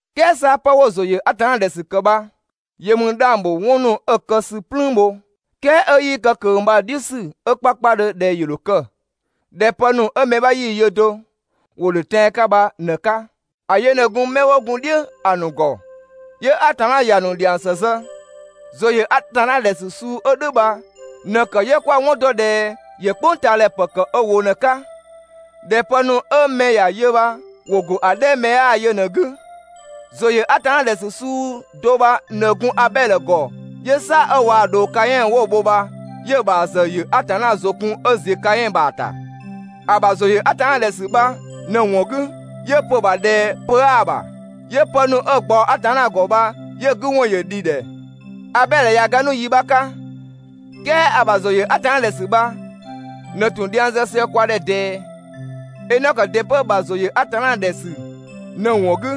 "Kɛɛ 'sa 'pë 'wo‑ ‑zʋ ‑yö Atanna ‑dhɛ ‑sü ‑kë bha yö ‑mü 'dhang‑ ‑bho 'wɔn ‑nu 'ö‑ kë ‑sü "plüün bho, "kɛɛ 'ö 'yii kë ꞊kö bha‑ "dhiʋ̈ ‑sü 'ö 'kpakpadhö ꞊dhɛ ‑yö ‑dho kë, ꞊dhɛ pë ‑nu 'ö mɛ 'bha 'yii‑ yö do, ‑wo ‑dhö tɛan‑ 'ka bha ꞊në‑ 'ka. ‑A yö ꞊në gun 'mɛ 'wo gun "dhiʋ̈ ‑a ‑nu ‑gɔ 'yö Atanna ‑ya ‑nu ‑dhiang ‑së zë. ‑Zʋ ‑yö Atanna ‑dhɛ ‑sü suu 'ö "dhʋ̈ bha ꞊në‑ ‑kë 'yö 'kwa‑ 'wɔn dɔ ꞊dhɛ ‑yö "kpʋngtaadhɛ ‑pë kë ö ‑wʋ ꞊në‑ 'ka, ꞊dhɛ pë ‑nu 'ö mɛ ‑ya yö bha ‑wo ‑go ‑a 'dhɛ 'ö mɛ 'yaa‑ yö ꞊në‑ 'gü. ‑Zʋ ‑yö Atanna ‑dhɛ ‑sü suu do bha ꞊në gun Abɛdhö ‑gɔ 'yö "saa‑ 'ö waa‑ ꞊dhoo Kaɛn 'wo‑ bho bha, 'yö‑ ‑bha ‑zë ‑yö Atanna ‑zʋ kun 'ö ‑ziö Kaɛn ‑bha ‑ta. ‑A ‑bha ‑zʋ ‑yö Atanna ‑dhɛ ‑sü bha ꞊në‑ ‑wɔn 'gü, 'yö‑ pö‑ ‑bha ꞊dhɛ pö 'aa‑ ‑bha, 'yö pë ‑nu 'ö‑ ꞊gbaɔ Atanna ‑gɔ bha, 'yö‑ 'gü ‑wɔn ‑yö ‑dhi ‑dhɛ. Abɛdhö ꞊ya ga 'nu yi 'bha 'ka, "kɛɛ ‑a ‑bha ‑zʋ ‑yö Atanna ‑dhɛ ‑sü bha ꞊në ‑tun dhiang zë sië kwa ‑dhɛ ꞊dɛɛ. Enɔkö ‑dɩ 'pö‑ ‑bha ‑zʋ ‑yö Atanna ‑dhɛ ‑sü ꞊në‑ ‑wɔn 'gü,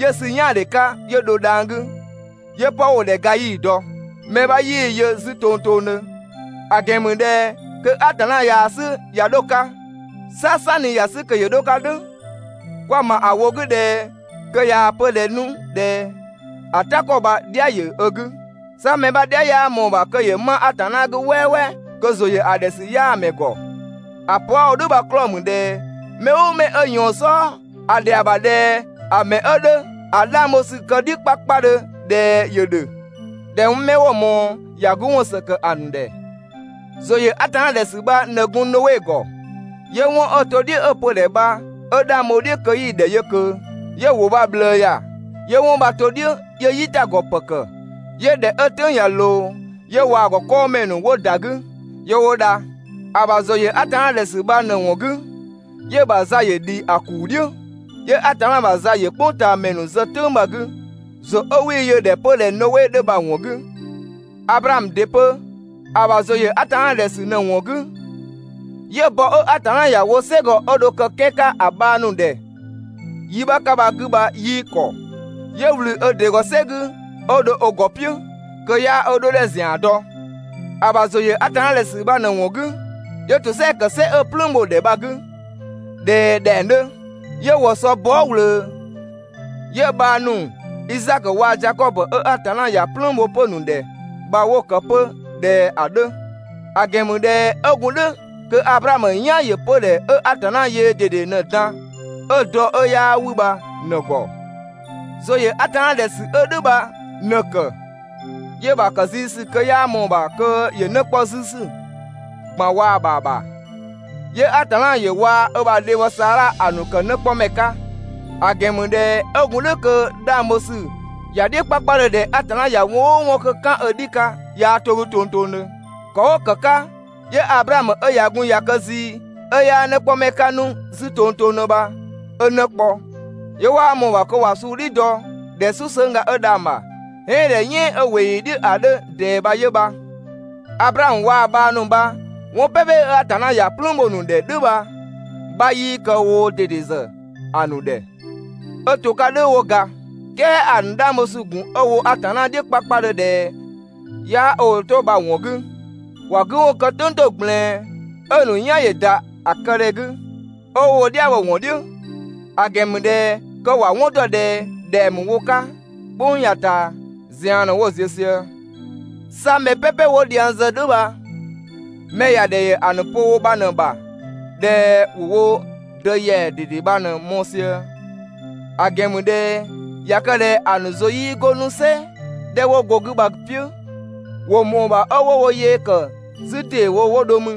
'yö‑ sü "yaandhe 'ka, 'yö dho dhang‑ 'gü 'yö 'pë 'wo‑ ‑dhɛ ga 'yii‑ dɔ. Mɛ 'bha 'yii‑ yö 'zü tongtongdhö, ‑a ‑gɛn ‑mü ꞊dhɛ kö Atanna yaa‑ 'sü ꞊ya 'dho‑ 'ka. 'Sa "sanni ‑ya 'sü kö ‑yö 'dho‑ 'ka "dhʋ̈, kwa‑ ‑ma ‑a ‑wʋ 'gü ꞊dhɛ kö ꞊yaa‑ pö‑ ‑dhɛ 'nu ꞊dhɛ ‑a "ta ‑kɔ bha‑ "dhia ‑yö ö 'gü. 'Sa mɛ 'bha "dhia 'yaa ꞊mɔɔ‑ ‑bha kö ‑yö 'ma Atanna 'gü "wɛɛwɛɛ kö ‑zʋ ‑yö ‑a ‑dhɛ ‑sü 'yaa‑ ‑mɛ ‑gɔ. ‑A pö 'a‑ wo "dhʋ̈ bha‑ 'klɔɔ‑ ‑mü ꞊dhɛ mɛ "ʋʋ mɛ 'ö ꞊yɔɔn‑ "sɔɔ, ‑a ‑dhɛa ‑bha ꞊dhɛ ‑a ‑mɛ 'ö 'dhö ‑a 'dhang bho ‑sü kë‑ "dhiʋ̈ 'kpakpadhö ꞊dhɛ ‑yö ‑dhö, ꞊dhɛ 'mɛ 'wo‑ ꞊mɔɔ, ‑ya 'gü ‑wɔn ‑së ‑kë ‑a ‑nu ‑dhɛ. ‑Zʋ ‑yö Atanna ‑dhɛ ‑sü bha ꞊në gun Noe ‑gɔ, 'yö 'wɔn 'ö‑ to "dhiʋ̈ 'ö‑ pö‑ ‑dhɛ bha 'ö 'dhang bho‑ "dhiʋ̈ kö 'yii‑ ‑dhɛ yö ꞊kö, 'yö‑ ‑wʋ bha‑ ꞊bhlëë ‑ya, 'yö 'wɔn bha‑ to "dhiʋ̈ 'yö "yitagɔ ‑pë ‑kë, 'yö ꞊dhɛ 'ö‑ "tʋ̈ng ꞊ya ꞊loo, 'yö waa‑ ‑gɔ 'kɔɔmɛ ‑nu 'wo ‑da 'gü, 'yö 'wo dha. ‑A ‑bha ‑zʋ ‑yö Atanna ‑dhɛ ‑sü bha ꞊në‑ ‑wɔn 'gü, 'yö‑ ‑bha za ‑yö ‑dhi ‑a ‑kuu "dhiʋ̈, 'yö Atanna ‑bha za ‑yö "kpʋngtaamɛ ‑nu zë "tʋ̈ng bha‑ 'gü ‑zʋ 'ö 'wii‑ yö‑ ‑dhɛ 'pö ꞊dhɛ Noe 'dhö bha‑ ‑wɔn 'gü. Ablaamö ‑dɩ 'pö, ‑a ‑bha ‑zʋ ‑yö Atanna ‑dhɛ ‑sü ꞊në‑ ‑wɔn 'gü, 'yö‑ bɔ 'ö Atanna ‑ya wo "sɛgɔ 'ö dho‑ kë‑ 'kɛan‑ 'ka ‑a bhang ‑nu ‑dhɛ yi 'bha 'ka bha‑ 'gü bha 'yii ‑kɔ. 'Yö ꞊wlü ö ‑dɩ ‑gɔ "sɛ 'gü 'ö dho ö ‑gɔ "piʋ̈, kö 'yaa ö 'dhodhɛ ‑zian ‑zian dɔ. ‑A ‑bha ‑zʋ ‑yö Atanna ‑dhɛ ‑sü bha ꞊në‑ ‑wɔn 'gü, 'yö ‑tosɛa ‑kë "sɛ 'ö‑ "plüün bho‑ ‑dhɛ bha‑ 'gü ꞊dhɛ ꞊dhɛng 'dhö. 'Yö ‑wɔ sɔ bɔɔ" ꞊wlöö, 'yö‑ bhang ‑nu, Izaakö waa‑ Zakɔbö 'ö Atanna ‑ya "plüün bho 'pö‑ ‑nu ‑dhɛ bha 'wo‑ ‑kë 'pö ꞊dhɛ ‑a 'dhö. ‑A ‑gɛn ‑mü ꞊dhɛ 'ö gun "dhʋ̈ kö Ablaamö "yan ‑yö 'pödhɛ 'ö Atanna yöö ꞊dede ꞊në‑ dan, 'ö‑ dɔ 'ö 'yaa 'wü bha ꞊në‑ ‑gɔ. ‑Zʋ ‑yö Atanna ‑dhɛ ‑sü 'ö "dhʋ̈ bha ꞊në‑ ‑kë, 'yö‑ ‑bha kë zii ‑sü kö 'yaa ꞊mɔɔ‑ ‑bha kö ‑yö 'në 'kpɔ 'zü ‑sü ꞊gban waa‑ ‑bha ‑bha, 'yö Atanna ‑yö waa‑ ‑bha dhebhɔ Saadha ‑a ‑nu ‑kë 'në 'kpɔmɛ 'ka. ‑A ‑gɛn ‑mü ꞊dhɛ 'ö gun "dhʋ̈ kö‑ 'dhang bho ‑sü ‑ya "dhiʋ̈ 'kpakpadhö ꞊dhɛ ꞊ya 'wɔn "ʋʋ 'wɔn 'kö‑ "kan ö "dhi 'ka, 'yaa 'to‑ 'gü tongtongdhö. ‑Kɔ 'ö ‑kë 'ka, 'yö Ablaamö 'ö ꞊ya gun ꞊ya kë zii, 'ö 'yaa 'në 'kpɔmɛ 'ka 'nu 'zü tongtongdhö bha 'ö 'në kpɔ, 'yö 'waa ꞊mɔɔ‑ ‑bha kö ‑wa suu "dhi dɔ ꞊dhɛ "susëngga 'ö dhang‑ ‑bha, "ɛɛn ꞊dhɛ "yɛɛn 'ö ꞊weeyi "dhiʋ̈ ‑a 'dhö ꞊dɛɛ bha 'yö bha. Ablaamö waa‑ bhang ‑nu bha 'wɔn "pɛpɛ 'ö Atanna ‑ya "plüün bho‑ ‑nu ‑dhɛ "dhʋ̈ bha‑ 'bha 'yii kë woo ꞊dede ‑zë ‑a ‑nu ‑dhɛ 'ö to‑ 'ka "dhʋ̈ 'wo ga. "Kɛɛ ‑a ‑nu 'dhang bho ‑sü gun 'ö‑ wo Atanna "dhiʋ̈ 'kpakpadhö ꞊dhɛ 'yaa ö ‑wʋ 'to bha‑ ‑wɔn 'gü, ‑wa 'gü ‑wɔn kë "tʋ̈ng ‑to ꞊gblɛɛn 'ö‑ ‑nu "yan ‑yö ‑da ‑a kë ‑dhɛ 'gü, 'ö 'wo wo "dhia bho‑ ‑wɔn "dhiʋ̈, ‑a ‑gɛn ‑mü ꞊dhɛ kö ‑wa 'wɔn ‑dɔ ꞊dhɛ ‑dhɛng ‑mü wo 'ka "kpʋng ya‑ ꞊taa, zian ꞊në 'wo‑ ziö sië. 'Sa mɛ "pɛpɛ 'wo dhiang zë "dhʋ̈ bha, mɛ ‑ya ‑dhɛ ‑yö ‑a ‑nu pö ‑wʋ bha ꞊në‑ ‑bha ꞊dhɛ ‑wo wo dë ‑yɛa ꞊dede bha ꞊në‑ mɔɔ‑ sië. ‑A ‑gɛn ‑mü ꞊dhɛ ꞊ya kë ꞊dhɛ ‑a ‑nu ‑zʋ 'yii 'go 'nu "sɛ 'dhɛ 'wo go‑ 'gü bha‑ "piʋ̈, ‑wo ‑mɔɔ ‑bha 'ö 'wo wo yee ‑kë 'zü ‑deewo 'wo dho mü.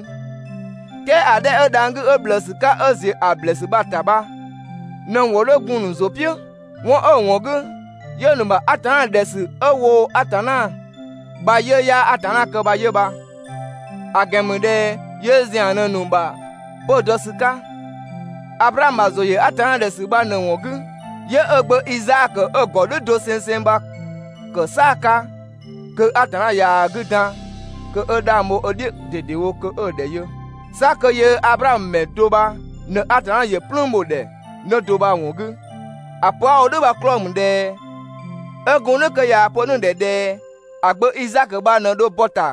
"Kɛɛ ‑a 'dhɛ 'ö dhang‑ 'gü 'ö ꞊bhlëësü 'ka 'ö ‑ziö ‑a ‑blɛɛsü bha‑ ‑ta bha ꞊në‑ ‑wɔn 'dhö gun‑ ‑nu ‑zʋ "piʋ̈. 'Wɔn 'ö‑ ‑wɔn 'gü, 'yö‑ ‑nu ‑bha Atanna ‑dhɛ ‑sü 'ö woo‑ Atanna bha‑ 'yiʋ̈‑ 'yaa Atanna kë bha 'yö bha. ‑A ‑gɛn ‑mü ꞊dhɛ yöö ‑zian ꞊në‑ ‑nu ‑bha 'pö‑ dɔ ‑sü 'ka. Ablaamö ‑bha ‑zʋ ‑yö Atanna ‑dhɛ ‑sü bha ꞊në‑ ‑wɔn 'gü, 'yö ö gbö Izaakö 'ö‑ ‑gɔ "dhʋ̈ dosengseng bha‑ ‑kë "saa‑ 'ka kö Atanna yaa‑ 'gü dan kö 'ö 'dhang bho ö "dhiʋ̈ ꞊dedewo kö 'ö‑ ‑dhɛ yö, 'sa kö yöö Ablaamö ‑mɛ do bha ꞊në Atanna ‑yö "plüün bho‑ ‑dhɛ 'në do bha‑ ‑wɔn 'gü. ‑A pö 'a‑ wo "dhʋ̈ bha‑ 'klɔɔ‑ ‑mü ꞊dhɛ 'ö gun "dhʋ̈ kö ꞊yaa‑ pö 'nu‑ ‑dhɛ ꞊dhɛ ‑a gbö Izaakö bha ꞊në dho bɔ‑ ‑ta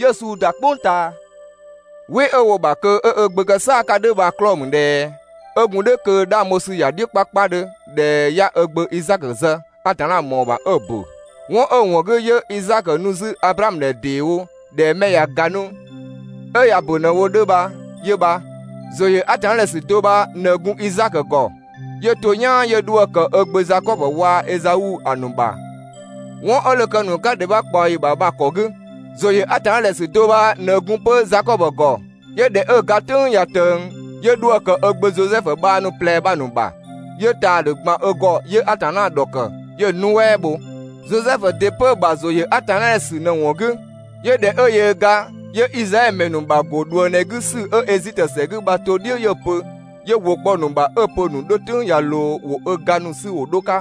'yö‑ suu ‑da "kpʋng ꞊taa. "Wɩ 'ö‑ wo‑ ‑bha kö 'ö ö gbö kë "saa‑ 'ka "dhʋ̈ bha‑ 'klɔɔ‑ ‑mü ꞊dhɛ 'ö gun "dhʋ̈ kö‑ 'dhang bho ‑sü ‑ya "dhiʋ̈ 'kpakpadhö ꞊dhɛ 'ya ö gbö Izaakö zë, Atanna ‑mɔɔ ‑bha 'ö‑ ‑bö. 'Wɔn 'ö‑ ‑wɔn 'gü, 'yö Izaakö nu 'zü Ablaamö ‑dhɛ ‑deewo ꞊dhɛ 'mɛ ꞊ya ga 'nu 'ö ꞊ya ‑bö ꞊në wo‑ 'dhö bha 'yö bha. ‑Zʋ ‑yö Atanna ‑dhɛ ‑sü do bha ꞊në gun Izaakö ‑gɔ 'yö to "yaan 'yö 'dhuë‑ ‑kë 'ö‑ gbö Zakɔbö waa‑ Ezau ‑a ‑nu ‑bha 'wɔn 'ö dho kë‑ ‑nu 'ka ‑dhɛ 'bha ꞊kpaɔyi ‑bha bha‑ ‑kɔ 'gü. ‑Zʋ ‑yö Atanna ‑dhɛ ‑sü do bha ꞊në gun 'pö Zakɔbö ‑gɔ 'yö ꞊dhɛ 'ö‑ ga "tʋ̈ng ꞊ya ꞊tëng, 'yö 'dhuë‑ ‑kë ö gbö Zosɛfu bhang ‑nu ꞊plɛ bha‑ ‑nu ‑bha, 'yö ‑taadhü ‑gban ö ‑gɔ 'yö Atanna ‑dhɔkë, 'yö‑ nuɛ" bho. Zosɛfu ‑dɩ 'pö‑ ‑bha ‑zʋ ‑yö Atanna ‑dhɛ ‑sü ꞊në‑ ‑wɔn 'gü, 'yö ꞊dhɛ 'ö yöö ga, 'yö Izraɛdhö ‑mɛ ‑nu ‑bha ‑go ꞊dhuëngdhɛ 'gü ‑sü 'ö Ezitö ‑sɛ 'gü bha‑ to "dhiʋ̈ 'yö‑ pö, 'yö ‑wʋ kpɔ‑ ‑nu ‑bha 'ö‑ pö‑ ‑nu 'dho "tʋ̈ng ꞊ya ꞊loo ‑wo ö ga ‑nu 'sü ‑wo 'dho‑ 'ka.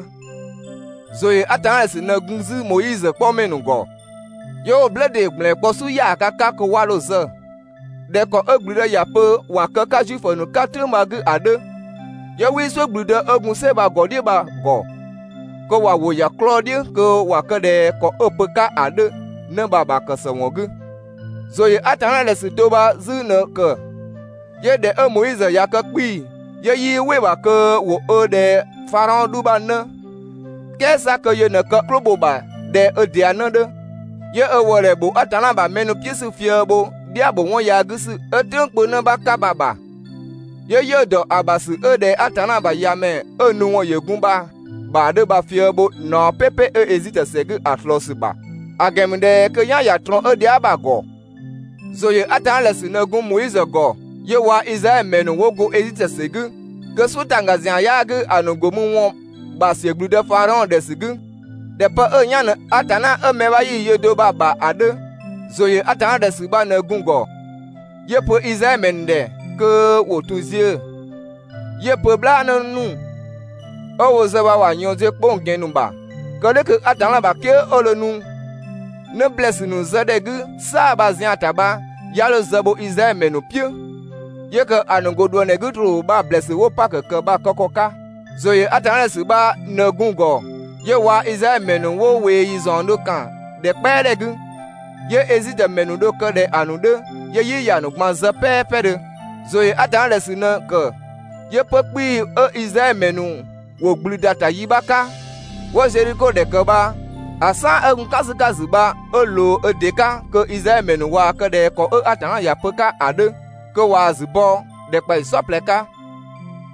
‑Zʋ ‑yö Atanna ‑dhɛ ‑sü ꞊në gun 'zü Moizö 'kpɔmɛ ‑nu ‑gɔ, 'yö 'wo‑ "blë ‑dee ‑gblɛn kpɔ "su ‑yaaga 'ka kö 'wa 'dho‑ zë (꞊dhɛ ‑kɔ 'ö ‑gblüdë ‑ya pö ‑wa kë‑ 'ka Zuifö ‑nu 'ka "tʋ̈ng bha‑ 'gü ‑a 'dhö), 'yö 'wii "suʋ̈ ‑gblüdë 'ö gun "sɛ bha‑ ‑gɔ "dhiʋ̈ bha‑ ‑gɔ, kö ‑wa ‑wʋ ‑ya 'klɔɔ‑ "dhiʋ̈ kö ‑wa kë ꞊dhɛ ‑kɔ 'ö‑ pö‑ 'ka ‑a 'dhö 'në bha‑ ‑bha ‑kë ‑së ‑wɔn 'gü. ‑Zʋ ‑yö Atanna ‑dhɛ ‑sü do bha 'zü ꞊në‑ ‑kë, 'yö ꞊dhɛ 'ö Moizö ꞊ya kë 'kpii‑, 'yö 'yii "wɩ‑ ‑bha kö ‑wo ö ‑dhɛ Fadhaɔn 'dhu ‑bha 'në, "kɛɛ 'sa kö yö ꞊në kë "klʋ bho‑ ‑bha ꞊dhɛ 'ö ‑dɩa 'në 'dhö. 'Yö ö ‑wëëdhɛ ‑bho Atanna ‑bha mɛ ‑nu "piʋ̈ ‑sü fië‑ bho "dhia ‑bho 'wɔn yaa 'gü ‑sü 'ö "tʋ̈ng kpö 'në 'bha 'ka bha‑ ‑bha. 'Yö 'yiʋ̈‑ ‑dɔ ö ‑bha ‑sü 'ö ꞊dhɛ Atanna ‑bha ‑Yamɛ 'ö‑ nu ‑wɔn ‑yö gun bha‑ ‑bha 'dhö bha‑ fië‑ bho ꞊naɔ "pɛpɛ 'ö Ezitö ‑sɛ 'gü ‑a ꞊slɔɔ ‑sü ‑bha, ‑a ‑gɛn ‑mü ꞊dhɛ kö‑ "yan ‑ya ꞊trɔɔn 'ö dhia" bha‑ ‑gɔ. ‑Zʋ ‑yö Atanna ‑dhɛ ‑sü ꞊në gun Moizö ‑gɔ 'yö waa Izraɛdhö ‑mɛ ‑nu 'wo go Ezitö ‑sɛ 'gü, kö "suʋ̈ ‑tangga ‑zian 'yaa‑ 'gü ‑a ‑nu ‑go mü ‑wɔn bha‑ ‑siö ‑gblüdë Fadhaɔn ‑dhɛ ‑sü 'gü, ꞊dhɛ pë 'ö‑ "yan ꞊në Atanna 'ö mɛ 'bha 'yii‑ yö do bha‑ ‑bha ‑a 'dhö. ‑Zʋ ‑yö Atanna ‑dhɛ ‑sü bha ꞊në gun‑ ‑gɔ, 'yö‑ pö Izraɛdhö ‑mɛ ‑nu ‑dhɛ kö ‑wo ‑tun ziö‑, 'yö‑ pö "bhlaanë ‑nu 'ö woo‑ zë bha ‑wa ꞊yɔɔn ziö 'kpong‑ ‑gɛn ‑nu ‑bha, kë "dhʋ̈ kö Atanna ‑bha "kië 'ö dho nu 'në ‑blɛɛsü ‑nu zë ‑dhɛ 'gü "saa‑ bha‑ zian‑ ‑ta bha 'ya 'dho zë bho Izraɛdhö ‑mɛ ‑nu "piʋ̈, 'yö ‑kë ‑a ‑nu ‑go ꞊dhuëngdhɛ 'gü ‑troo bha‑ ‑blɛɛsü 'wo‑ Pakö ‑kë bha‑ kë ‑kɔ 'ka. ‑Zʋ ‑yö Atanna ‑dhɛ ‑sü bha ꞊në gun‑ ‑gɔ 'yö waa‑ Izraɛdhö ‑mɛ ‑nu 'wo ꞊weeyi ‑zaɔndhö ‑kan ‑dhɛ "kpɛadhɛ 'gü, 'yö Ezitö ‑mɛ ‑nu dho‑ kë ꞊dhɛ‑ ‑nu 'dhö, 'yö "yi ‑ya ‑nu ꞊gban zë "pɛɛpɛdhö. ‑Zʋ ‑yö Atanna ‑dhɛ ‑sü ꞊në‑ ‑kë 'yö 'pö‑ 'kpii‑ 'ö Izraɛdhö ‑mɛ ‑nu ‑wo ‑gblü ‑da ‑ta yi 'bha 'ka 'wo‑ Zedhiko ‑dhɛ ‑kë bha, ‑a "saan 'ö gun "kan ‑sü 'ka‑ ‑zü bha 'ö ꞊loo ö ‑dɩ 'ka kö Izraɛdhö ‑mɛ ‑nu ꞊waa‑ kë ꞊dhɛ ‑kɔ 'ö Atanna ‑ya pö‑ 'ka ‑a 'dhö, kö ꞊waa‑ ‑zü bɔ ‑dhɛkpaɔyi "saɔplɛ 'ka.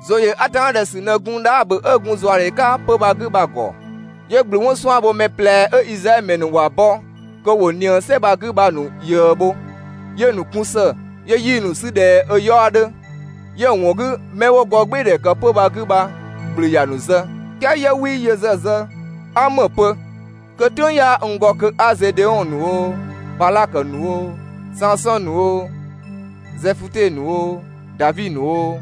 ‑Zʋ ‑yö Atanna ‑dhɛ ‑sü ꞊në gun Dhaabö 'ö gun ‑zuadhe 'ka 'pö‑ bha‑ 'gü bha‑ ‑gɔ, 'yö ‑gblü 'wɔn 'suan‑ bho ‑mɛ ꞊plɛ 'ö Izraɛdhö ‑mɛ ‑nu ‑wa bɔ kö ‑wo ꞊nië "sɛ bha‑ 'gü bha‑ ‑nu ꞊yëë bho, 'yö‑ ‑nu kun ‑së 'yö 'yii‑ ‑nu 'sü ꞊dhɛ ö 'yaɔ‑ 'dhö, 'yö‑ ‑wɔn 'gü, 'mɛ 'wo gɔɔgbɩɩdhɛ ‑kë 'pö‑ bha‑ 'gü bha, ‑gblü ‑ya ‑nu zë, "kɛɛ 'yö 'wii yö ‑zë zë. 'A ‑më pö? Kö "tʋ̈ng 'yaa n ‑gɔ kö 'a Zedeɔn ‑nu oo, Badhakö ‑nu oo, Sansɔn ‑nu oo, Zɛfute ‑nu oo, Davi ‑nu oo,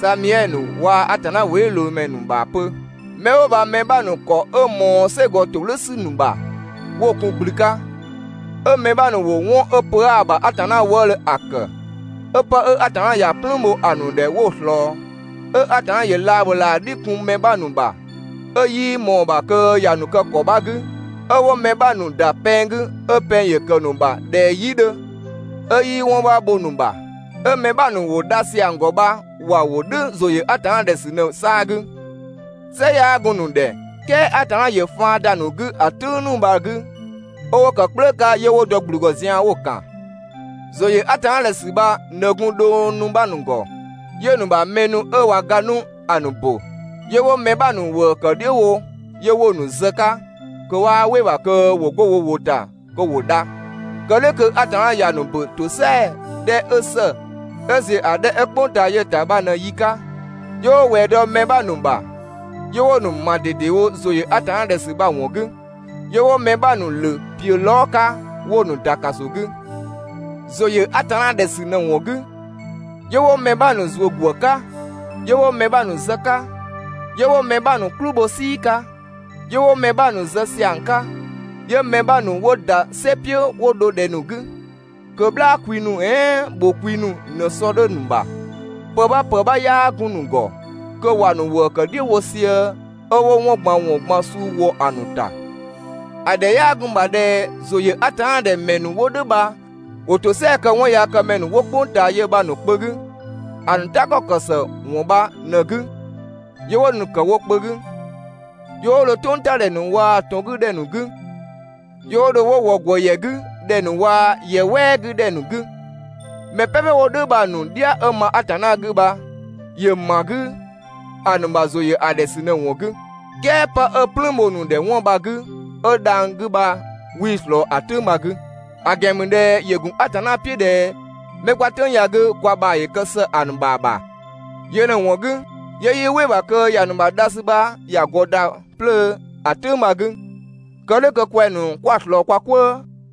Samiɛdhö ‑nu waa‑ Atanna ‑wʋdhiʋ̈loomɛ ‑nu ‑bha pö. 'Mɛ 'wo bha‑ mɛ 'bha ‑nu ‑kɔ 'ö ꞊mɔɔ "sɛgɔ ‑todhʋ̈ ‑sü ‑nu ‑bha 'wo‑ kun ‑gblü 'ka, 'ö‑ mɛ 'bha ‑nu ‑wo 'wɔn 'ö pö 'aa‑ ‑bha Atanna wëëdhö ‑a ‑kë, 'ö 'pë 'ö Atanna ‑ya "plüün bho ‑a ‑nu ‑dhɛ 'wo‑ ꞊slɔɔ, 'ö Atanna ‑yö laabhölaa "dhi kun mɛ 'bha ‑nu ‑bha 'ö 'yii ꞊mɔɔ‑ ‑bha kö ‑ya ‑nu kë ‑kɔ 'bha 'gü, 'ö 'wo‑ mɛ 'bha ‑nu ‑da pɛng 'gü, 'ö pɛng ‑yö ‑kë ‑nu ‑bha ꞊dhɛ "yi 'dhö, 'ö 'yii 'wɔn 'bha bho‑ ‑nu ‑bha, 'ö‑ mɛ 'bha ‑nu ‑wo dha ‑siang ‑gɔ bha ‑wa ‑wo "dhʋ̈ ‑zʋ ‑yö Atanna ‑dhɛ ‑sü ꞊në‑ "saa‑ 'gü. "Sɩ 'yaa gun‑ ‑nu ‑dhɛ, "kɛɛ Atanna ‑yö kë faan ‑da ‑nu 'gü ‑a "tʋ̈ng ‑nu bha‑ 'gü 'ö 'wo ‑kë "kplëë 'ka 'yö 'wo dɔ ‑gblü ‑gɔ zian‑ 'wo‑ ‑kan. ‑Zʋ ‑yö Atanna ‑dhɛ ‑sü bha ꞊në gun dhong ‑nu 'bha ‑nu ‑gɔ 'yö‑ ‑nu ‑bha mɛ ‑nu 'ö ꞊wa ga 'nu ‑a ‑nu ‑bö. 'Yö 'wo‑ mɛ 'bha ‑nu ‑wëë ‑kë "dhiʋ̈ wo 'yö 'wo‑ ‑nu zë‑ 'ka kö 'waa "wɩ‑ ‑bha kö ‑wo 'go wo ‑wʋ ‑ta kö ‑wo dha, kë "dhʋ̈ kö Atanna ‑ya ‑nu ‑bö ‑tosɛa 'dhɛ 'ö ‑së 'ö ‑ziö ‑a 'dhɛ 'ö "kpʋng ꞊taa yö‑ ‑ta bha ꞊në‑ yi 'ka. 'Yö 'wo ꞊wɛɛ dɔ‑ mɛ 'bha ‑nu ‑bha, 'yö 'wo‑ ‑nu ‑ma ꞊dedewo ‑zʋ ‑yö Atanna ‑dhɛ ‑sü bha‑ ‑wɔn 'gü. 'Yö 'wo‑ mɛ 'bha ‑nu ‑lö ‑piö lɔɔ" 'ka 'wo‑ ‑nu ‑da ‑kaso 'gü. ‑Zʋ ‑yö Atanna ‑dhɛ ‑sü ꞊në‑ ‑wɔn 'gü, 'yö 'wo mɛ 'bha ‑nu ‑zuö ‑gwë 'ka, 'yö 'wo‑ ‑nu zë‑ 'ka, 'Yö 'wo‑ mɛ 'bha ‑nu "kplü bho "sii 'ka, 'yö 'wo‑ mɛ 'bha ‑nu zë ‑siang 'ka, 'yö‑ mɛ 'bha ‑nu 'wo ‑da "sɛ "piʋ̈ 'wo dho ‑dhɛ ‑nu 'gü kö "bhlaa kwi ‑nu "ɛɛn ‑bhʋ kwi ‑nu ꞊në‑ sɔ 'dhö‑ ‑nu ‑bha, pë 'bha ‑pë 'bha 'yaa gun‑ ‑nu ‑gɔ, kö ‑wa ‑nu ‑wëë ‑kë "dhiʋ̈ wo sië, 'ö 'wo 'wɔn ꞊gban ‑wɔn ꞊gban suu ‑wɔ ‑a ‑nu ‑ta. ‑A ‑dhɛ 'yaa gun‑ ‑bha ꞊dhɛ ‑zʋ ‑yö Atanna ‑dhɛ ‑mɛ ‑nu 'wo "dhʋ̈ bha ‑wo ‑tosɛa kë 'wɔnyaakëmɛ ‑nu 'wo "kpʋng ꞊taa yö bha‑ ‑nu kpö 'gü, ‑a ‑nu "ta ‑kɔ ‑kë ‑së ‑wɔn bha ꞊në‑ 'gü 'yö 'wo‑ ‑nu ‑kë 'wo kpö 'gü, 'yö 'wo dho "tʋngtadhɛ ‑nu waa‑ ‑tɔn 'gü ‑dhɛ ‑nu 'gü, 'yö 'wo dho 'wo ‑wɔ ‑gwë ‑yɛ 'gü ‑dhɛ ‑nu waa‑ ‑yɛ "wɛɛ 'gü ‑dhɛ ‑nu 'gü. Mɛ "pɛpɛ 'wo "dhʋ̈ bha‑ ‑nu "dhia 'ö ma Atanna 'gü bha ‑yö ‑ma 'gü ‑a ‑nu ‑bha ‑zʋ ‑yö ‑a ‑dhɛ ‑sü ꞊në‑ ‑wɔn 'gü. "Kɛɛ kö pë 'ö‑ "plüün bho‑ ‑nu ‑dhɛ 'wɔn bha‑ 'gü 'ö dhang‑ 'gü bha 'wii‑ ꞊slɔɔ ‑a "tʋ̈ng bha‑ 'gü. ‑A ‑gɛn ‑mü ꞊dhɛ ‑yö ‑gun Atanna "piʋ̈ ꞊dhɛ 'mɛ 'kwa "tʋ̈ng ya‑ 'gü kwa ‑bha ‑yö kë ‑së ‑a ‑nu ‑bha ‑bha, yö ꞊në‑ ‑wɔn 'gü 'yö 'yii "wɩ‑ ‑bha kö ‑ya ‑nu ‑bha dha ‑sü bha ‑ya ‑gɔ ‑da 'plöö ‑a "tʋng bha‑ 'gü, kë "dhʋ̈ kö kwɛng‑ ‑nu 'kwa‑ ꞊slɔɔ kwa "kwëë.